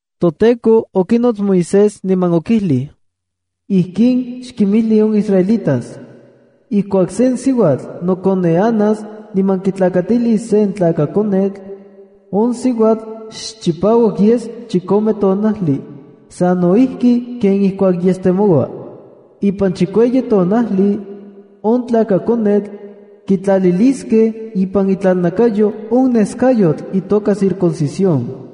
ToTEKO okinots Moisés niman okijli: “Ijkin xkinmijli on israelitas: Ijkuak sen siuatl nokoneanas niman kitlakatilis sen tlakakonetl, on siuatl xchipauak yes chikome tonajli, sano ijki ken ijkuak yestemoua. Ipan chikueyi tonajli, on tlakakonetl, kitlaliliskej ipan itlalnakayo on neskayotl itoka circuncisión.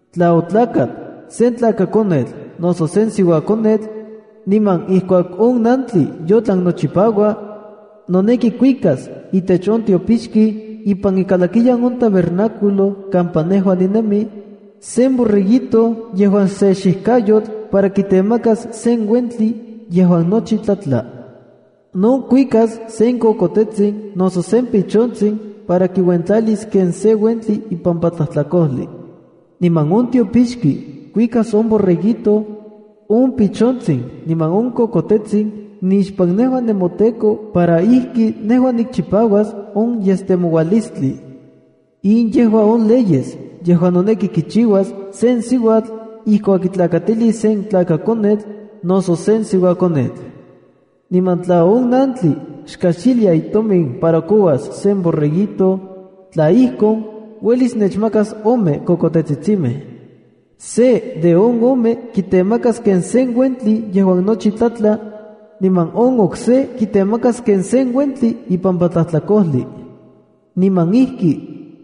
’Tla otlakat sen tlakakonetl noso sen siuakonetl, niman ijkuak on nantli yotlan nochipaua, noneki kuikas itech on tiopixki ipan ikalakiyan on tabernáculo kampa nejua ninemi, sen borreguito yejuan se xijkayotl para kitemakas sen uentli yejuan nochi tlatla. No kuikas sen kokotetsin noso sen pichontsin para kiuentlalis se uentli ipampa tlajtlakojli. Niman on tiopixki kuikas on borreguito, on pichontsin niman on kokotetsin nixpan nejua nemoTEKO para ijki nejua nikchipauas on yestemoualistli.” In yejua on leyes yejuan noneki kichiuas sen siuatl ijkuak kitlakatilis sen tlakakonetl noso sen siuakonetl. Niman tla on nantli xkajxilia itomin para kouas sen borreguito, tla ijkon, uelis nechmakas ome kokotetsitsimej. Se de on ome kitemakas ken sen uentli yejuan nochi tlatla, niman on okse kitemakas ken sen uentli ipampa tlajtlakojli. Niman ijki,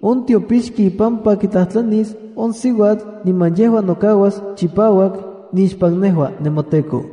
on tiopixki ipampa kitlajtlanis on siuatl niman yejua nokauas chipauak nixpan nejua nemoTEKO.